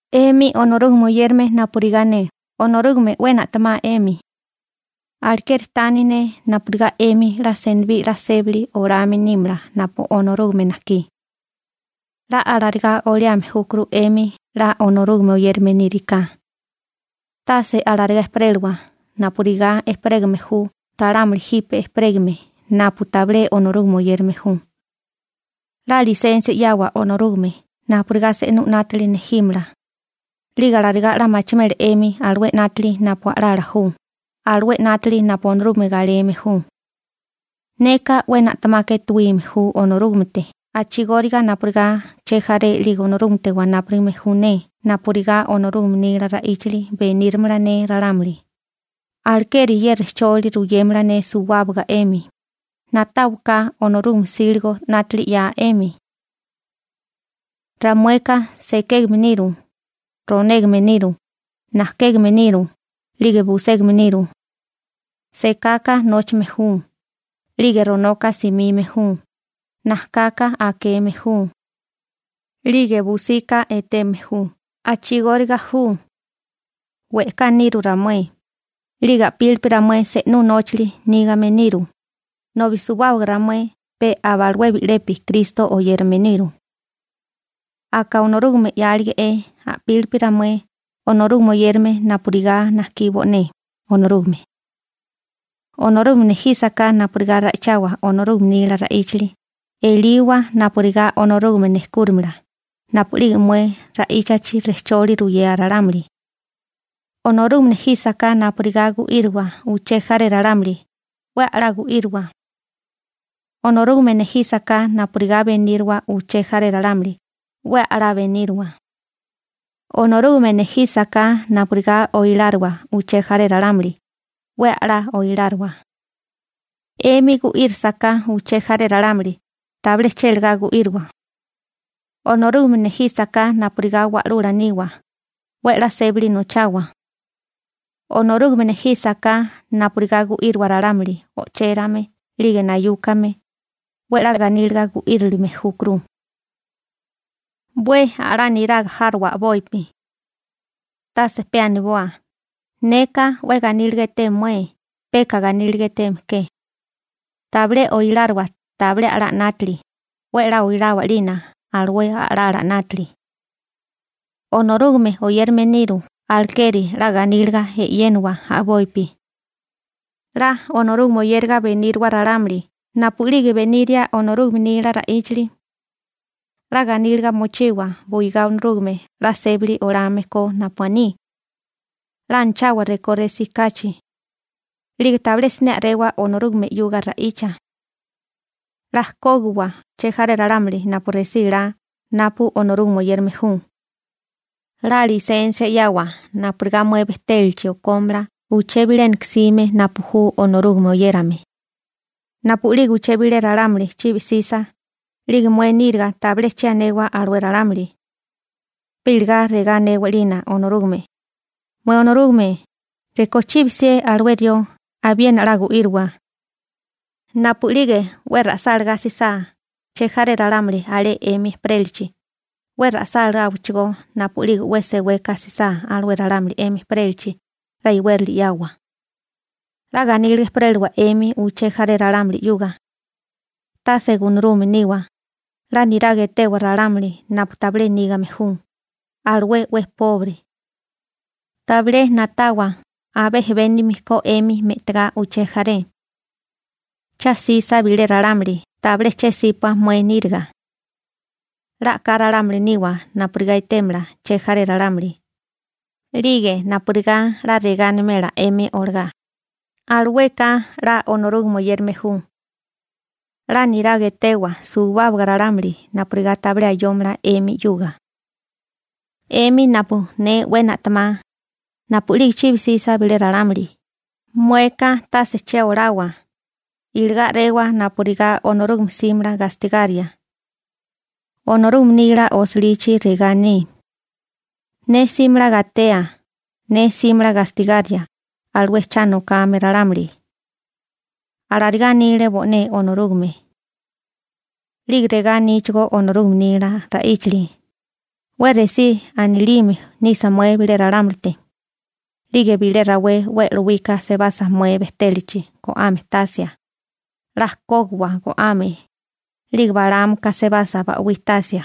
'Emi Onorúgame oyérame napurigá ne, Onorúgame 'we na'temá 'emi. Alekeri tani ne napurigá 'emi 'la senibí 'la sébali olame nímala napu Onorúgame najkí. 'La alarigá oliame júkuru 'emi 'la Onorúgame oyérame níriká. Tase alarigá ejperélawa napurigá ejperégame ju ralámuli jipe ejperégame napu tabilé Onorúgame oyérame ju. 'La lisensia 'yawa Onorúgame napurigá se'nú 'nátili nejímala. 'Lige alarigá 'la machimela 'emi alué 'nátili napu a'lala ju, alué 'nátili napu Onorúgame galeme ju. Neka 'we na'temaka etuíme ju Onorúgamete a'chigóriga napurigá chejaré 'lige Onorúgamete wanápurigame ju ne napurigá Onorúgame nila ra'íchali beníramala ne ralámuli, alekeri ye rejcholi ruyémala ne suwábaga 'emi: «Na'táwaká Onorúgame 'síligo 'nátali 'ya 'emi.» Ramueka sekégame niru, ronégame niru, najkégame niru, 'lige buségame niru. Sekaka nóchame ju, 'lige ronoka simime ju, najkaka akeme ju, 'lige busika eteme ju. A'chigóriga ju. We'ká niru ramué, 'lige a'pílipi ramué se'nú nóchali nígame niru, nobi suwábaga ramué pe abalué bi'lepi Kristo oyérame niru. Aka Onorúgame 'yálige'é a'pílipi ramué Onorúgame oyérame napurigá najkí bo'né Onorúgame. Onorúgame nejísaká napurigá ra'ichawa Onorúgame nila ra'íchali, eliwa napurigá Onorúgame nejkúrimala napu'lige mué ra'íchachi rejcholi ruyea ralámuli. Onorúgame nejísaká napurigá gu'íriwa uché jaré ralámuli, 'we a'lá gu'íriwa. Onorúgame nejísaká napurigá beníriwa uché jaré ralámuli, 'we a'lá beníriwa. Onorúgame nejísaká napurigá oiláriwa uché jaré ralámuli, 'we a'lá oiláriwa. 'Emi gu'írisaká uché jaré ralámuli, tabilé chélagá gu'íriwa. Onorúgame nejísaká napurigá wa'lula niwa, 'we 'la sébali nochawa. Onorúgame nejísaká napurigá gu'íriwa ralámuli o'chérame 'lige nayúkame, 'we a'lá ganíliga gu'írilime júkuru. 'We a'lá niraga járowa a'bopi. Tase pe aniboa: «Neka 'we ganíliga eté mué», peka ganíliga eteme ke. Tabilé oiláriwa tabilé a'lá 'nátili, 'we 'la oilawa 'lina alué a'lala 'nátili. Onorúgame oyérame niru alekeri 'la ganíliga e'yéniwa a'bopi. 'La Onorúgame oyériga beníriwa ralámuli napu'lige beniria Onorúgame nila ra'íchali. 'La ganíliga mochiwa buigá Onorúgame 'la sébili olame ko napu aní. 'La anachawa rekó resí kachi. 'Lige tabilé siné a'rewa Onorúgame 'yuga ra'icha. 'La kógiwa chejaré ralámuli napu resí laa napu Onorúgame oyérame ju. 'La lisensia 'yawa napurigá mué bejtélachi okómala uché bilénaka jsime napu ju Onorúgame oyérame. Napu'lige uché bilé ralámuli chibi 'sisa, 'lige mué níriga tabilé che anewa alué ralámuli. Pe iligá regá anewa 'lina Onorúgame: «Mué Onorúgame, rekó chibi 'sié alué rió, abiena 'la gu'írowa.» Napu'lige 'we ra'sálagá sisá chejaré ralámuli alé 'emi ejperélachi, 'we ra'sáláwachigó. Napu'lige 'we seweka jsisá alué ralámuli 'emi ejperélachi 'la iwérali 'yawa. 'La ganíliga ejperélawa 'emi uché jaré ralámuli 'yuga. Tase gunarume niwa, 'la niraga etewa ralámuli napu tabilé nígame ju, alué 'we pobre. Tabilé na'tawa abé ejebénigame ko 'emi me'tigá uché jaré. Cha 'sisa bilé ralámuli tabilé che 'sípua mué níriga. 'La a'ká ralámuli niwa napurigá etémala che jaré ralámuli, 'lige napurigá 'la regá animela 'emi olagá: «Alueka 'la Onorúgame oyérame ju.» 'La niraga etewa suwábaga ralámuli napurigá tabilé ayómala 'emi 'yuga. 'Emi napu ne 'we na'temá, napu'lige chibi 'sisa bilé ralámuli, mueka tase che olawa, iligá a'rewa napurigá Onorúgame 'símala gastigaria. Onorúgame nila osilichi regá aní: «Ne 'símala gatea, ne 'símala gastigaria alué cha nokame ralámuli.» Alarigá anile bo'né Onorúgame. 'Lige regá aníchigó Onorúgame nila ra'íchali: «'We resí anilime nisa mué bilé ralámulite, 'lige bilé rawé 'we e'lowika sebasa mué bejtélachi go'ame tasia, 'la kógiwa go'ame, 'lige balámaka sabasa ba'wí tasia,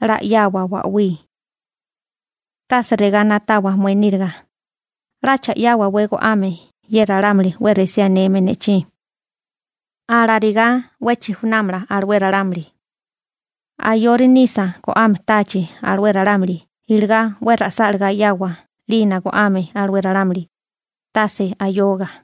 'la 'yawa ba'wí. Tase regá na'tawa mué níriga: 'Lacha 'yáwawé go'ame ye ralámuli 'we resí aneme ne'chí. Alarigá 'we chijunámala alué ralámuli.» Ayori nisa go'ame táachi alué ralámuli iligá 'we ra'sálagá 'yawa 'lina go'ame alué ralámuli, tase ayoga.